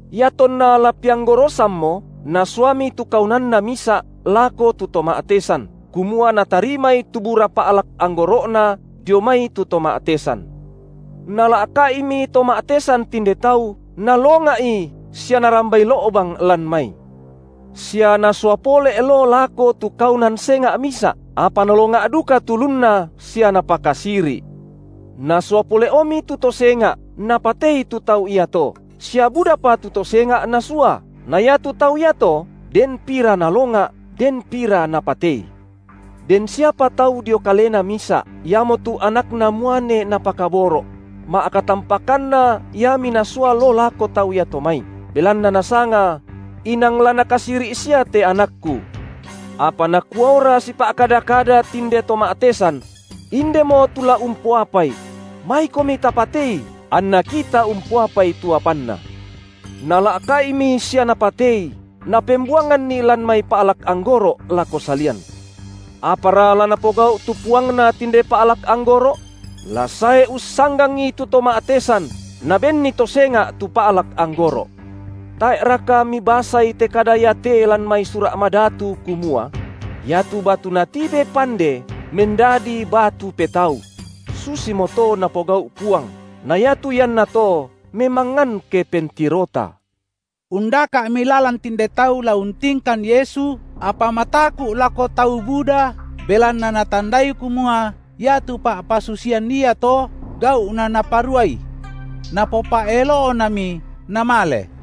Iatonna la peanggorosammo nasuami tu kaunanna misa’ lako tu to ma’tesan, kumua natarimai tu bura pa’lak anggoro’na dio mai tu to ma’tesan. Nala’ka’imi to ma’tesan tinde tau nalonga’i sia narambai lo’bang lan mai. Sia nasua pole’ loo lako tu kaunan senga’ misa’, apa nalonga’ duka tu ulunna sia napakasiri’. Nasua pole’omi tu to senga’, napatei tu tau iato, sia budapa tu to senga’ nasua, na iatu tau iato den pira nalonga’ den pira napatei. Den siapa tau dio kalena misa’, iamotu anakna muane napakaboro’; ma’katampakanna iami nasua loo lako tau iato mai, belanna nasanga: inang la nakasiri’ sia te anakku. Apa nakuaora sipa’kada-kada tinde to ma’tesan: Indemo tu la umpoapai; maikomi tapatei, anna kita umpoapai tu apanna. Nala’ka’imi sia napatei, napembuanganni lan mai pa’lak anggoro’ lako salian. Apara la napogau’ tu puangna tinde pa’lak anggoro’? La sae ussanggangi tu to ma’tesan, nabenni to senga’ tu pa’lak anggoro’. Tae’raka mibasai te kada iate lan mai Sura’ Madatu kumua: Iatu batu natibe pande mendadi batu petau; Susimoto Napogau’ Puang, na iatu iannato memangngan ke pentirota. Undaka’mi lalan tinde tau la untingkan Yesu, apa mataku’ lako tau buda, belanna natandai kumua iatu pa’pasusian iato, gau’na Naparuai. Napopa’elo’nami namale.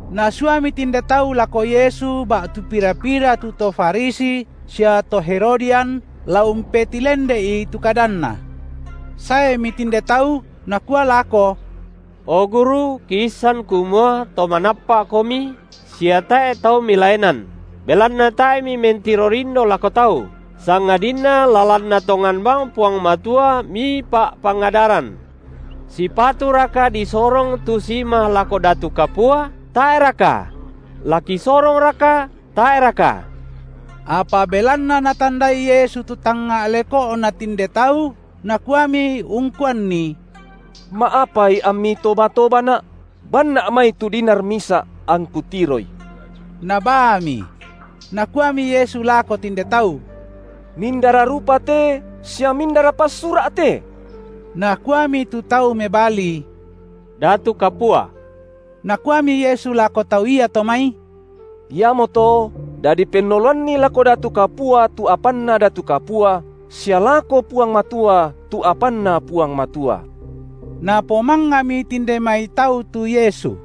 Nasuami tinde tau lako Yesu ba’tu pira-pira tu to Farisi sia to Herodian, la umpetilende’i tu kadanNa. Saemi tinde tau, nakua lako: O Guru kiissan kumua to manappa’Komi sia tae’ tau Milaenan, belanna tae’ Mimentiro lindo lako tau, sangadinna lalanna tongan bang Puang Matua Mipa’pangadaran. Sipaturaka disorong tu sima lako datu kapua, tae’raka? La kisorongraka, tae’raka? Apa belanna Natandai Yesu tu tangnga’ leko’na tinde tau, Nakuami ungkuanni: Ma’apai ammi toba-tobaNa’? BanNa’ mai tu dinar misa’, angKu tiroi. Nabaami. Nakuami Yesu lako tinde tau: Mindara rupa te sia mindara passura’ te? Nakuami tu tau mebali: datu kapua. Nakuami Yesu lako tau iato mai: Iamoto dadi pennoloanni lako datu kapua tu apanna datu kapua sia lako Puang Matua tu apanNa Puang Matua. Napomangami tinde mai tau tu Yesu.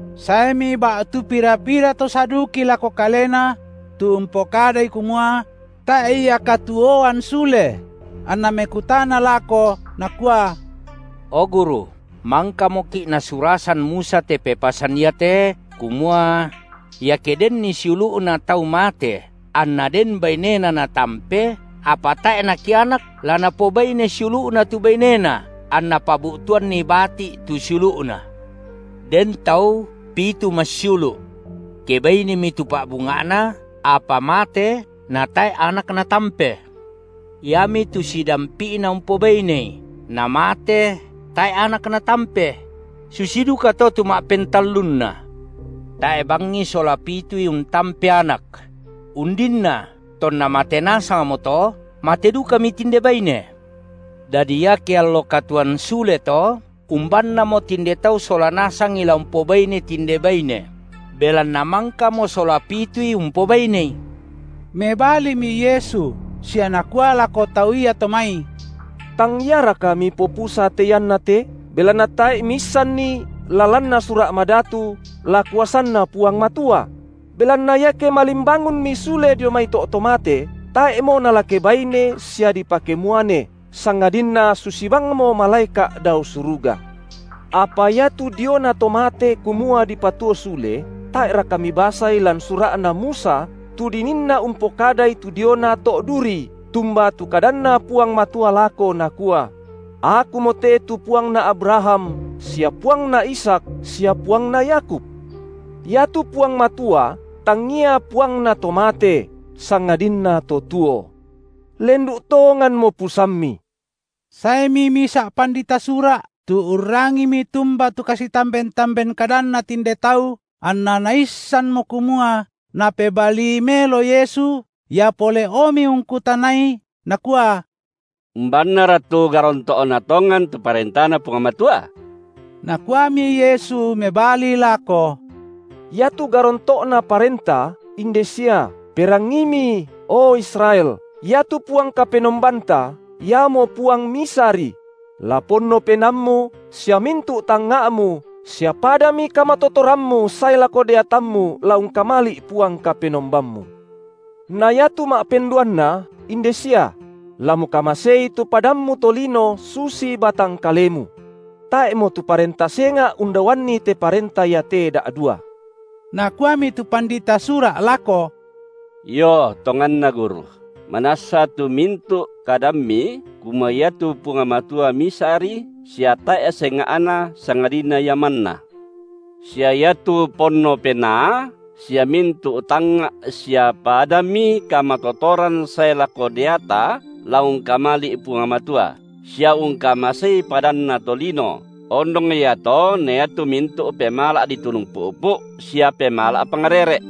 Saemi ba’tu pira-pira to Saduki lako Kalena – tu umpokadai kumua: tae’ ia katuoan sule – anna mekutana lako, nakua: O Guru, mangkamoki’ nasurasan Musa te pepasan iate, kumua: iake denni siulu’na tau mate, anna den bainena natampe, apa tae’ nakianak, la napobaine siulu’na tu bainena anna pabu’tuanni bati’ tu siulu’na. Den tau pitu massiulu’. Kebainemi tu pa’bunga’na, apa mate natae’ anak natampe. Iami tu sidampi’na umpobainei, namate tae’ anak natampe; susi dukato tu ma’pentallunna. Tae’ bangi sola pitui untampe anak; undinna tonna mate nasangmo to, mate dukami tinde baine. Dadi iake allo katuoan sule to, umbannamo tinde tau sola nasang la umpobainei tinde baine? Belanna mangkamo sola pitui umpobainei. Mebalimi Yesu sia nakua lako tau iato mai: Tang iaraka mipopusa te iannate, belanna tae’ miisanni la lanna Sura’ Madatu, la kuasanNa Puang Matua? Belanna iake malimbangunmi sule dio mai to’ to mate, tae’mo nala kebaine sia dipakemuane, sangadinna susi bangmo malaeka’ dao suruga. Apa iatu diona to mate kumua dipatuo sule, tae’raka mibasai lan sura’na Musa tu dininna umpokadai tu diona to’ duri, tumba tu kadanNa Puang Matua lako, Nakua: Akumote tu Puangna Abraham sia Puangna Ishak sia Puangna Yakub? Iatu Puang Matua tangia Puangna to mate, sangadinna to tuo. Lendu’ tonganmo pusammi. Saemi misa’ pandita Sura’, tu urrangimi tumba tu kasitamben-tamben kadanna tinde tau anna naissanmo kumua Napebalii melo Yesu, ia pole’omi ungkutanai, nakua: Umbannara tu garonto’na tongan tu ParentaNa Puang Matua? Nakuami Yesu mebali lako: Iatu garonto’na parenta inde sia; Perangiimi, o Israel, Iatu Puang Kapenombanta Iamo Puang Misari; la ponno penaammu sia mintu’ tangnga’mu sia padami kamatotorammu sae lako deatammu la ungkamali’ Puang Kapenombammu. Na iatu ma’penduanna inde sia: La mukamasei tu padammu tolino susi batang kalemu. Tae’mo tu parenta senga’ undaoanni te parenta iate da’dua. Nakuami tu pandita Sura’ lako: Io tonganna, Guru, manassa tu mintu’ kadamMi kumua iatu Puang Matua Misari sia tae’ senga’na sangadinna Ia manna; sia iatu ponno penaa sia mintu’ tangnga’ sia padami kamatotoran sae lako deata la ungkamali’ Puang Matua, sia ungkamasei padanta tolino, ondong ia to na iatu mintu’ pemala’ ditunu pu’pu’ sia pemala’ pangrere’.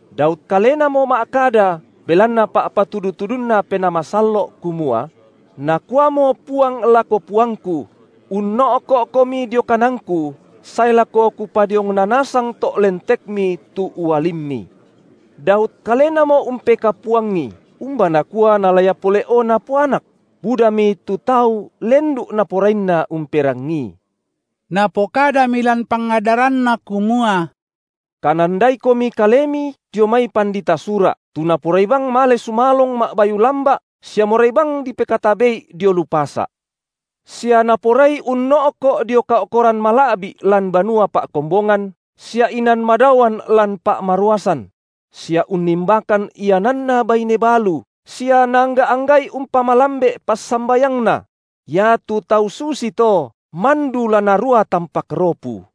Daud kalenamo ma’kada belanna pa’patudu-tudunNa Penaa Masallo’ kumua: Nakuamo Puang lako Puangku: Unno’ko’Komi dio kananKu sae lako Kupadiongna nasang to’ lentekMi tu ualimMi. Daud kalenamo umpekapuangi, umba nakua nala ia pole’o napoanak? Budami tu tau lendu’ naporainna umperangii. Napokadami lan pangadaranNa kumua: Kanandaikomi kalemi dio mai pandita Sura’, tu naporai bang male sumalong ma’bayu lamba’ sia morai bang dipekatabe’i dio lu pasa’, sia naporai unno’ko’ dio kao’koran mala’bi’ lan banua pa’kombongan sia inan madaoan lan pa’maruasan; sia unnimbakan iananna baine balu, sia naangga’-angga’i umpamalambe’ passambayangna; iatu tau susito mandu la narua tampak ropu.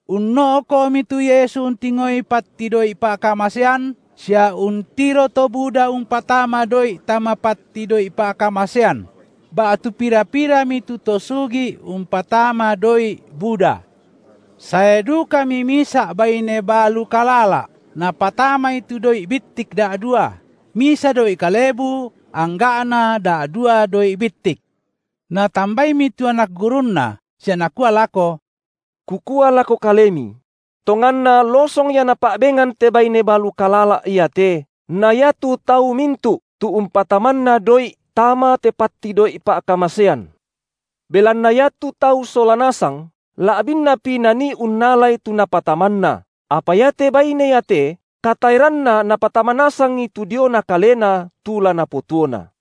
Unno’ko’mi tu Yesu untingoi patti doi’ pa’kamasean, sia untiro to buda umpatama doi’ tama patti doi’ pa’kamasean; ba’tu pira-pirami tu to sugi’ umpatama doi’ buda. Sae dukami misa’ baine balu kalala’, napatamai tu doi’ bittik da’dua, misa doi’ kalebu angga’na da’dua doi’ bittik. Natambaimi tu anak gurunNa sia Nakua lako: Kukua lako Kalemi: Tonganna losong ia napa’bengan te baine balu kalala’ iate na iatu tau mintu’, tu umpatamanna doi’ tama te patti doi’ pa’kamasean. Belanna iatu tau sola nasang la’binnapi nanii unnalai tu napatamanna, apa iate baine iate kataeranna napatama nasangi tu diona kalena tu la napotuona.